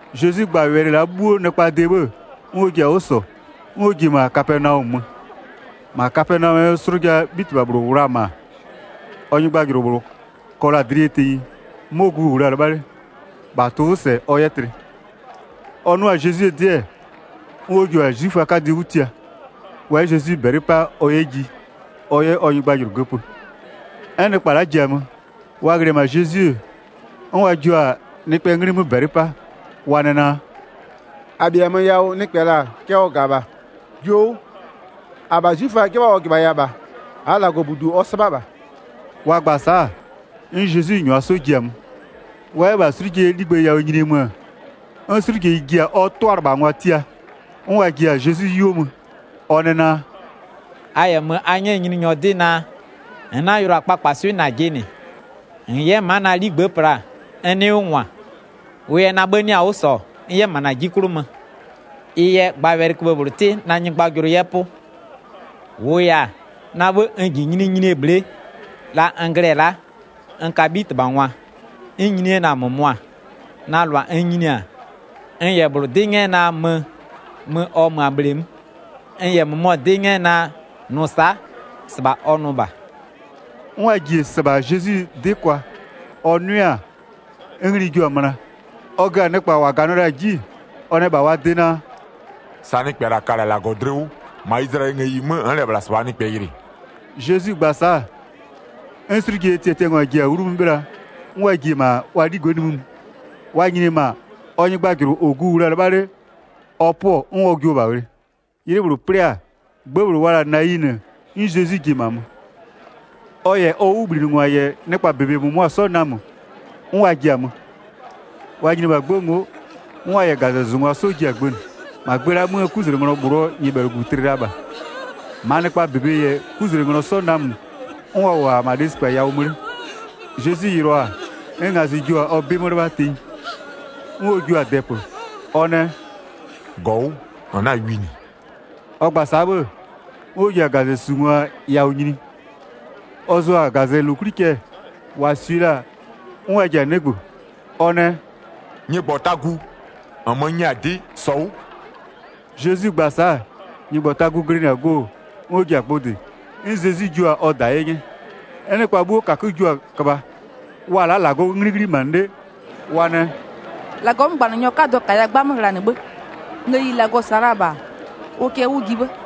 Zezwi gba-a wɛlɩ la'a 'bhuo nɩkpaa de 'bhë-ë, 'n ɔ ji-a 'wʋ -sɔ, 'n ɔ ji-e -ma Kapɛnaɔmö mö. 2-Ma Kapɛnaɔmö, 'slʋjaa 'bhitɩbha -bhlʋ -wʋ la-a -ma, ɔ nyɩgbajʋlʋ -bhlʋ kɔ la-a dlɩ yɛ tenyi, 'mɔ gu -wʋ la-a 'lɩbha 'le, -bha tʋ-ʋ 'wʋ -sɛ ɔ 'yɛ tlɩ. Ɔ 'nʋ-a Zezwie 'dɩ-ɛ, 'n ɔ jio-a 'zwiföaa 'kadɩ 'wʋ tia, wa 'yɛ Zezwi -bɛlɩ 'pa ɔ 'yɛ ji, ɔ 'yɛ ɔ nyɩgbajʋlʋ göpö. 'N nɩkpa la'a ji-a mö, wa ghlɩ-ɛ -ma Zezwi, 'n wa jio-a nɩkpɛɛ 'nglɩ 'mö -bɛlɩ 'pa, wa nɛ naa: “-A -bhiamö yawʋ nɩkpɛ -la cɛ ɔ -ga -bha, jio 'wʋ. 5-Abha 'zwiföa 'jɩbha ɔ -jɩbhaya -bha, -aa -Lagɔbudu ɔ 'sɩbha -bha.” Wa gba-a sa'a, 'n Zezwi -nyʋa 'sɔ ji-a mö. Wa 'yɛ -bha 'slʋjeyie 'ligbë yawʋ nyinie mö, 'n 'slʋjeyi ji-a ɔ 'tʋalɩbhangwa tia, 'n wa ji-a Zezwi 'yuo mö, ɔ nɛ naa: “A -yɛ mö a 'nyɛ Nyininyɔ 'dɩ naa: -N 'na-a yʋlʋa kpakpaswɩ'ɩ -najɩ -nɩ, -n 'yɛ ma'a na 'ligbë'ë pla n 'nɩɩ 'wʋ -ngwa. Wʋ yɛ na 'bhë 'nɩ-a 'wʋ -sɔ n 'yɛ -ma -na 'ji 'klʋ mö. Ɩ yɛ gba wɛlɩköbhë -bhlʋ 'tɩ na nyɩgbajʋlʋ 'yɛ 'pʋ. 8-Wʋʋ yɛ-a, na 'bhë n -ji nyininyinie bhle'e, la n glɩ-ɛ la'a, n ka 'bhitɩbhangwa, 'n n nyini 'yɛ-ɛ na-a -mʋmʋa, na -lʋa n nyini-a, n -yɛ -bhlʋ 'dɩ 'nyɛ naa mö, mö ɔ mö-a bhleemö, n -yɛ -mʋmɔ 'dɩ 'nyɛ naa: Nʋ sa'a, -sɩbha ɔ nʋ -bha.” 'N wa ji-e -sɩbha Zezwi 'dɩ kwa, ɔ 'nʋɩ-a, 'n ngli jio-a möna, ɔ gö-a nɩkpa -wa -ganɩɔ la-a 'ji, ɔ nɛ -bha wa de naa: “Sa nɩkpɛ -la ka-a -Lagɔ dlɩ 'wʋ, -ma Izlayɛlɩɛ ngëyi 'mö n'n -lɛ -bhla -sɩbhaa nɩkpɛ yɩlɩ.” Zezwi gba-a sa'a, 'n 'slʋjeyie tiatiangwa ji-a 'wlu 'mö 'bhɩla 'n wa ji-e -ma ɔ 'ligbë'ë nimï mö. Wa nyini-e -ma, ɔ nyɩgbajʋlʋ -ɔ gu -wʋ la-a 'lɩbha 'le, ɔ 'pʋɔ 'n wa jio-o -bha ghlɩ. 'Ylɩ -bhlʋ 'plɩ-a, 'gbë -bhlʋ wa la-a Nayinɩ, 'n Zezwi ji-e -ma mö. Ɔ -yɛ ɔ 'wʋbhlinɩngwa -yɛ nɩkpaa -bebe -mʋmʋa 'sɔ namö 'n wa ji-a mö. Wa nyini-e -bha 'gbë ngo'o, 'n wa -yɛ -gazɛzʋngwa 'sɔ ji-a gbënɩ. -Ma gbë la'a 'möö 'kuzlenglɔ -bhlʋɔ nyɩbhɛlʋgu tlɩ la -bha, -maa nɩkpaa -bebe -yɛ 'kuzlenglɔ 'sɔ namö 'n wa -wʋ-ɔ -ma lesikpa yawʋ mö 'le. Zezwi yɩlɩɔ-a, 'n ngazɩ jio-a ɔ 'bɩ 'mö 'lɩbha tenyi. 'N ɔ jio-a dɛpö, ɔ nɛ: “-Gɔ 'wʋ, -n 'na-a wi -nɩ.” Ɔ gba-a sa'a 'bhë, 'n ɔ ji-a -gazɛsungwa yawʋ nyini. Ɔ zʋ-a -gazɛlokwli cɛ, -wa -swie la-a 'n wa ji-a 'nɩgbö, ɔ nɛ: “Nyɩgbɔtagu, -nmö n nyɛ-a 'dɩ, -sɔ 'wʋ!” Zezwi gba-a sa'a, nyɩgbɔtagu glɩnɩ-a go 'n ɔ ji-a gbʋ -dɩ, 'n Zezwi jio-a ɔ -da 'ye 'nyɛ. 'N nɩkpa 'bhuo -kakö jua-a köbha, wa-a la'a -Lagɔɔ 'nglɩ 'ghlimanɩ 'le, wa nɛ: “-Lagɔɔ 'mögbanɩnyɔ 'kadɔ -kaya 'gbamö ghlanɩ 'bhë. Ngëyi -Lagɔ -sa la-a -bha ʋ kɛ 'wʋ ji 'bhë.”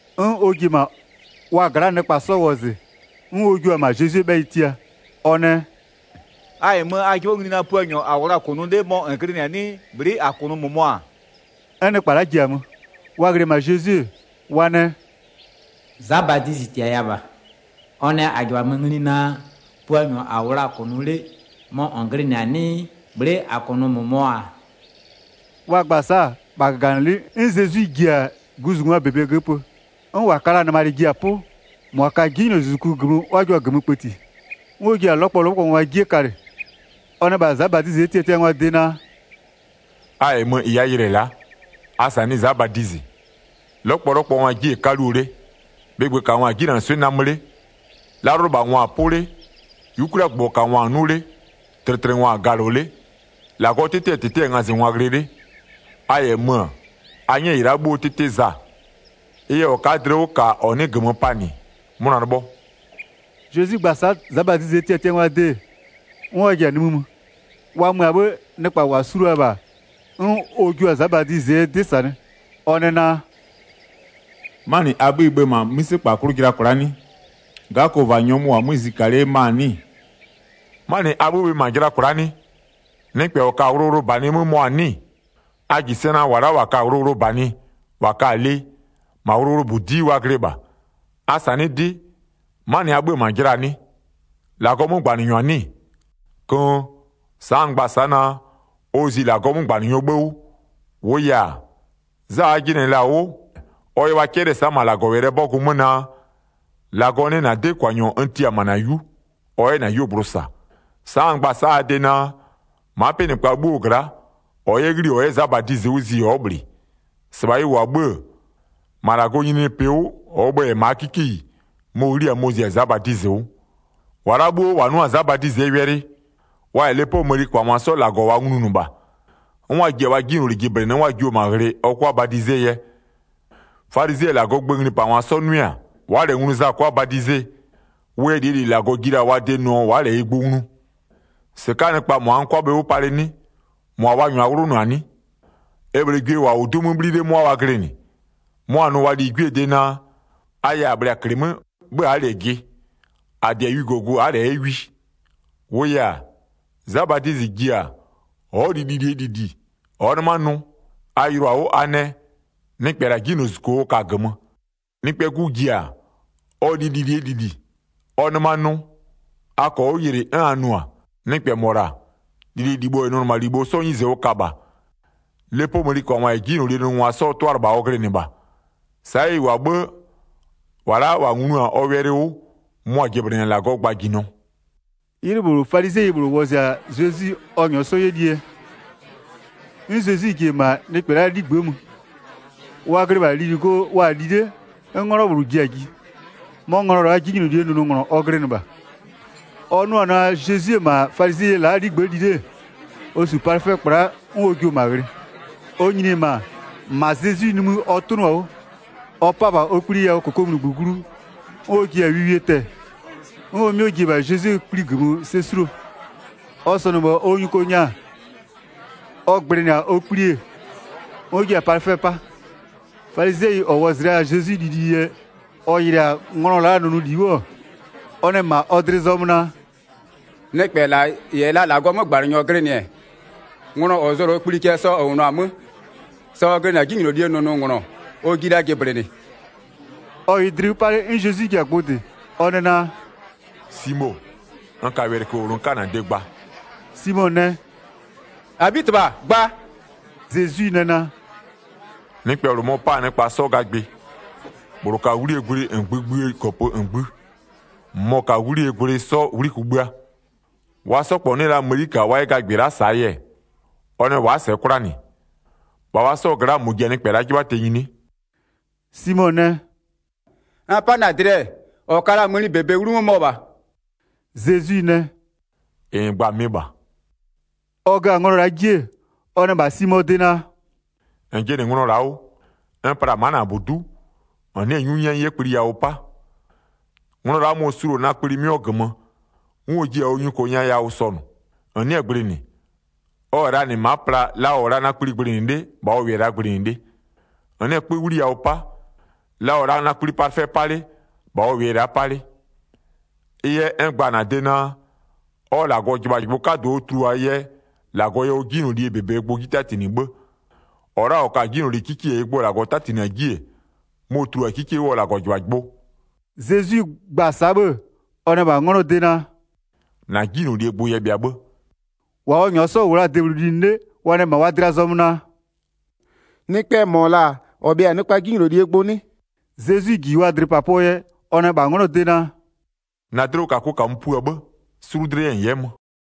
'N ɔ ji-e -ma wa gla'aa nɩkpa 'sɔ wɔzɩ, 'n ɔ jua-a -ma Zezwie 'bhɛyɩ tia, ɔ nɛ: “A -yɛ mö-ö, a 'jɩbhɔ ngli naa, Puanyɔ -a -wʋ la-a -kʋnʋ 'le, mɔ -n glɩnɩ-a 'nɩɩ, bhlɩ'ɩ -a -kʋnʋ -mʋmɔ-a?” 'N nɩkpa la'a ji-a mö, wa ghlɩ-ɛ -bha Zezwi, wa nɛ: “Za Badizɩ -tiaya -bha, ɔ nɛ -a -jɩbhamö ngli naa Puanyɔ -a -wʋ la-a -kʋnʋ 'le, mɔ -n glɩnɩ-a 'nɩɩ, bhlɩ'ɩ -a -kʋnʋ -mʋmɔ-a?” Wa gba-a sa'a, -bha -gaganɩlɩ'ɩ, 'n Zezwi ji-a guzungwaa -bebe göpö, 'n -wa ka la-a nɩmalɩ ji-a 'pʋ, -mʋa ka-a 'jinylozuzuku -gömö 'n ɔ jua-a -gömö kpëti, 'n ɔ ji-a 'lɔkpɔlɔkpɔngwaa 'jie kalɩ. Ɔ nɛ -bha Za Badizɩɛ tiatiangwaa de naa: “A -yɛ mö -ɩ a yɩlɩ-ɛ la'a, a -sanɩɩ Za Badizɩ. 'Lɔkpɔlɔkpɔngwaa 'jie-e 'kaluo 'le, bhɩgbökangwa-a 'jinanɩswɩ'ɩ namö 'le, 'lalʋlɩbhangwa-a 'pʋ 'le, 'yukwliagbʋgbɔkangwa-a 'nʋ 'le, tlɩtlɩngwa-a galɔ 'le, -Lagɔɔ 'tɩtɩɛ -tɩtɩ-ɛ ngazɩngwa ghlɩ 'le. A -yɛ mö-ö, a 'nyɛ -ɩ la'a bhuo 'tɩtɩ Za. Ɩ yɛ -ɔ ka'a dlɩ 'wʋ -ka -ɔ nɩ'ɩ -gömö panɩ, 'mʋna 'lɩbhɔ.” Zezwi gba-a sa'a Za Badizɩɛ tiatiangwaa de, 'n wa ji-a nimï mö. Wa mö-a 'bhë-ë, nɩkpa -wa su la-a -bha, 'n ɔ jua-a Za Badizɩɛ 'dɩ -sanɩ, ɔ nɛ naa: “'Manɩ a 'bhö-ö bhe -ma 'mïsekpa 'klʋ jɩla kwla'a 'nɩ? 'Gakova nyɔmʋ -wʋ-a 'mö zika 'le ma-a 'nɩ-ɩ? 'Manɩ a 'bhö-ö bhe -ma jɩla kwla'a 'nɩ? Nɩkpɛ -ɔ ka-a wʋlʋwʋlʋbanɩ 'mö mɔ-a 'nɩ-ɩ? A -ji sɛ naa -wa la'a -wa ka-a wʋlʋwʋlʋbanɩ, -wa ka-a lɩ, -ma wʋlʋwʋlʋbudi'i wa glɩ -bha. A -sanɩ'ɩ 'dɩ, 'manɩ a 'bhö-ö -ma jɩlaa 'nɩ? -Lagɔɔ 'mögbanɩnyɔ-a 'nɩ-ɩ? Köön! Sa'a n gba-a sa'a naa, ɔ zi -Lagɔɔ 'mögbanɩnyɔɔ 'bhë 'wʋ. 27-Wʋʋ yɛ-a, Za a jɩnɩ-ɛ -la 'wʋ, ɔ yɛ wa 'cɛlɩ-ɛ -ma -Lagɔwɛlɩɛ 'bɔgʋ 'mö naa: -Lagɔ nɛ -na 'dɩkwanyɔ n tia-a -ma -na 'yu, ɔ 'yɛ -na 'yuogblʋ -sa. Sa'a n gba-a sa'a a de naa, ma'a 'pɩnɩkpa 'bhuoo gla'a, -ɔ 'yɛ 'ghli-i -ɔ 'yɛ Za Badizɩ 'wʋ zi ɔ'ɔ -bhlɩ. -Sɩbha ɩ -wʋ-a 'bhë-ë, -ma -Lagɔɔ nyininyinipɩ 'wʋ, -ɔɔ bhë-ë -yɛ-a -maa 'kikeyi mɔ-ɔ 'ghli-a mɔ-ɔ zi-a Za Badizɩ 'wʋ. 29-Wa la'a 'bhuo -wa 'nʋ-a Za Badizɩɛ wɛlɩ 'mö, wa -yɛ lepoo mëniköbhangwa 'sɔ -Lagɔ wa nglunʋ -bha, 'n wa ji-a wa 'jinyloli jɩblɩnɩ 'n wa jio-o -ma ghlɩ ɔ 'kʋa badizee yɛ. Falizɩɛ -yɛ -Lagɔɔ gböö nglipangwa 'sɔ 'nʋɩ-a, wa'a -lɛ nglu Za 'kʋa badize, wʋ yɛ -lie -li -Lagɔ ji la-a wa de nʋɔ wa'a -lɛ ɩ gbʋ nglu. 31-Sɩka'aa nɩkpa, -mʋa n 'kʋa bhe 'wʋ palɩ 'nɩ, -mʋa wa -nyʋa 'wlʋnʋ-a 'nɩ? E -bhlee gwie -wa -wʋ-a 'du 'mö 'bhli 'le 'mʋa wa glɩnɩ, mʋa-a nʋ wa ligwiee de naa, a yɛ -a bhlɩ-a -klɩmö 'bhë a'a -lɛ jɩ. -A -dɩ-a wijogu a'a -lɛ 'yɛ wi. 33-Wʋʋ yɛ-a, Za Badizɩ ji-a, ɔ'ɔ li lilie -lili, ɔ'ɔ 'nɩma nʋ. A yɩlɩɔ-a 'wʋ a nɛ: Nɩkpɛ -la 'jinylozuzuko ɔ ka-a -gömö. Nɩkpɛɛ 'Gu ji-a, ɔ li lilie -lili, 'n ɔ nɩma-a nʋ, a -kɔɔ 'wʋ yɩlɩ, 'n a nʋ-a: Nɩkpɛ -mɔ -la, lililibho -yɛ nʋnɩmalibho 'sɔɔ 'nyize ɔ ka -bha. Lepoo mëniköbhangwa -yɛ 'jinylolie nʋnʋngwa 'sɔɔ 'tʋalɩbha ɔ glɩnɩ -bha. Sa'a ɩ -wʋ-a 'bhë, -wa la'a -wa nglu-a ɔ wɛlɩ 'wʋ, mʋa-a 'jɩblɩnɩ-a -Lagɔɔ gbajinɔ.” 'Ylɩ -bhlʋ, falizɩɛyi -bhlʋ wɔzɩ-a Zezwi ɔ -nyɔɔ 'sɔ 'yɛ lie yɛ. 'N Zezwi ji-e -ma nɩkpɛ la'aa 'ligbë'ë mö. Wa glɩ -bha lili go wa-a li 'le, 'n 'nglɔ -bhlʋ ji-a ji. 'Mɔ nglɔ la'a, 'jinylolie nʋnʋnglɔ ɔ glɩnɩ -bha. Ɔ 'nʋ-ɔ naa, Zezwi-e -ma falizɩɛyi la'aa 'ligbë'ë li 'le, ɔ -su palɩfɛɛ 'kpla 'n ɔ jio-o -ma ghlɩ. Ɔ nyini-e -ma, -ma Zezwi nimï ɔ 'tʋnʋ-a 'wʋ, ɔ 'pa-a -bha ɔ kpli yawʋ -kokomunigbö glu, 'n ɔ ji-a wiwie tɛ-ɛ, 'n ɔ 'mɩɔ ji-e -bha Zezwie kpli -gömö sɛ 'suluo. Ɔ sɔnʋ-ɔ -bha ɔ nyuko nya, ɔ gblɩnɩ-a ɔ kpli-e, 'n ɔ jiɩ-a palɩfɛ 'pa. Falizɩɛyi -ɔ wɔzɩ la-a Zezwi lili yɛ, ɔ yɩlɩ-a nglɔ la'aa nʋnʋli 'wʋ-ɔ, ɔ nɛ -ma ɔ dlɩ zɔmö naa: “Nɩkpɛ -la -yɛ la -Lagɔɔ 'mögbanɩnyɔ glɩnɩ-ɛ, nglɔ -ɔ zʋ-ɔ -la ɔ kpli cɛ sa ɔ -wʋnʋ-a 'mö, sa ɔ glɩnɩ-a 'jinylolie nʋnʋnglɔ ɔ jiɩ la jɩblɩnɩ.” Ɔ -wʋɩ dlɩ 'wʋ 'pa 'le, 'n Zezwi ji-a gbʋ -dɩ, ɔ nɛ naa: “Simo, n ka wɛlɩköbhë -bhlʋ n 'ka -na de gba.” Simo nɛ: “-Abhitɩbha, gba.” Zezwi nɛ naa: “Nɩkpɛ -bhlʋ mɔ-ɔ 'pa-a nɩkpa 'sɔ gagbɩ. -Bhlʋ ka 'wlie gwlɩ -ngbï -ngbïë -gɔpö -ngbï, -mʋmɔ ka 'wlie gwlɩ 'sɔ 'wli kugbïa. Wa 'sɔ -kpɔ 'nɩ la mëni -ka wa 'yɛ gagbɩ la'a -saa yɛ, ɔ nɛ wa'a -sɛɛ 'kwla -nɩ. -Bha wa 'sɔɔ gla'a, -mɔ ji-a nɩkpɛ la'a 'jɩbhaa tenyi 'nɩ?” Simo nɛ: “N 'pa-a na-a dlɩ-ɛ, -ɔ ka la-a mëni -bebe 'wlumö, mɔ -bha.” Zezwi nɛ: “-Ɩ -n gba-a mɩ -bha.” Ɔ gö-a nglɔ la'a 'ji-e, ɔ nɛ -bha Simoo de naa: “-N jɩnɩ nglɔ la'a 'wʋ? N pla-a ma'a -na -budu'u, -n nɩ'ɩ-ɛ 'nyu 'nyɛ n 'yɛ kpli yawʋ 'pa, nglɔ la'a mɔ-ɔ suluo-o na kpli 'mɩɔ -gömö 'n ɔ jiɩ-a ɔ nyuko nya yawʋ sɔnʋ. 45-N nɩ'ɩ-ɛ gblɩnɩ, ɔ -yɛ la -nɩ ma'a pla la ɔ -wʋ la-a na kpli gblɩnɩ 'le -bha ɔ -wʋɩ-ɛ la'a gblɩnɩ 'le. 46-N nɩ'ɩ-ɛ 'kpö 'wliyawʋ 'pa, la ɔ -wʋ la-a na kpli palɩfɛ 'pa 'le -bha ɔ -wʋɩ-ɛ la'a 'pa 'le. Ɩ yɛ n gba-a -na de naa: Ɔ -Lagɔjɩbhajɩbhʋ 'kadʋ ɔ tuluaa yɛ -Lagɔ yɛ ɔ 'jinyloli -bebee gbʋ 'ji 'tatinɩ 'bhë. -Ɔ la'a -ɔ ka-a 'jinyloli 'kikie -ɩɩ gbʋ -Lagɔ 'tatinɩ-a 'ji-e, mɔ-ɔ tulua-a 'kikie 'wʋ ɔ -Lagɔjɩbhajɩbhʋ.” Zezwi gba-a sa'a 'bhë ɔ nɛ -bha 'nglɔɔ de naa: “-Na 'jinylolie gbʋ yɛ bhɩa 'bhë.” 49-Wa ɔ -nyʋa 'sɔ -wʋ la-a debhlʋ linɩ 'le wa nɛ -ma wa dlɩa zɔmö naa: “Nɩkpɛɛ -mɔ -la-a -ɔ bhɩa-a nɩkpaa 'jinylolie gbʋ 'nɩ?” Zezwi -ji wa dlɩpapʋɔ yɛ, ɔ nɛ -bha 'nglɔɔ de naa: “-Na dlɩwʋkakʋ -kamö pua 'bhë, sulu dlɩ yɛ n 'yɛ mö.”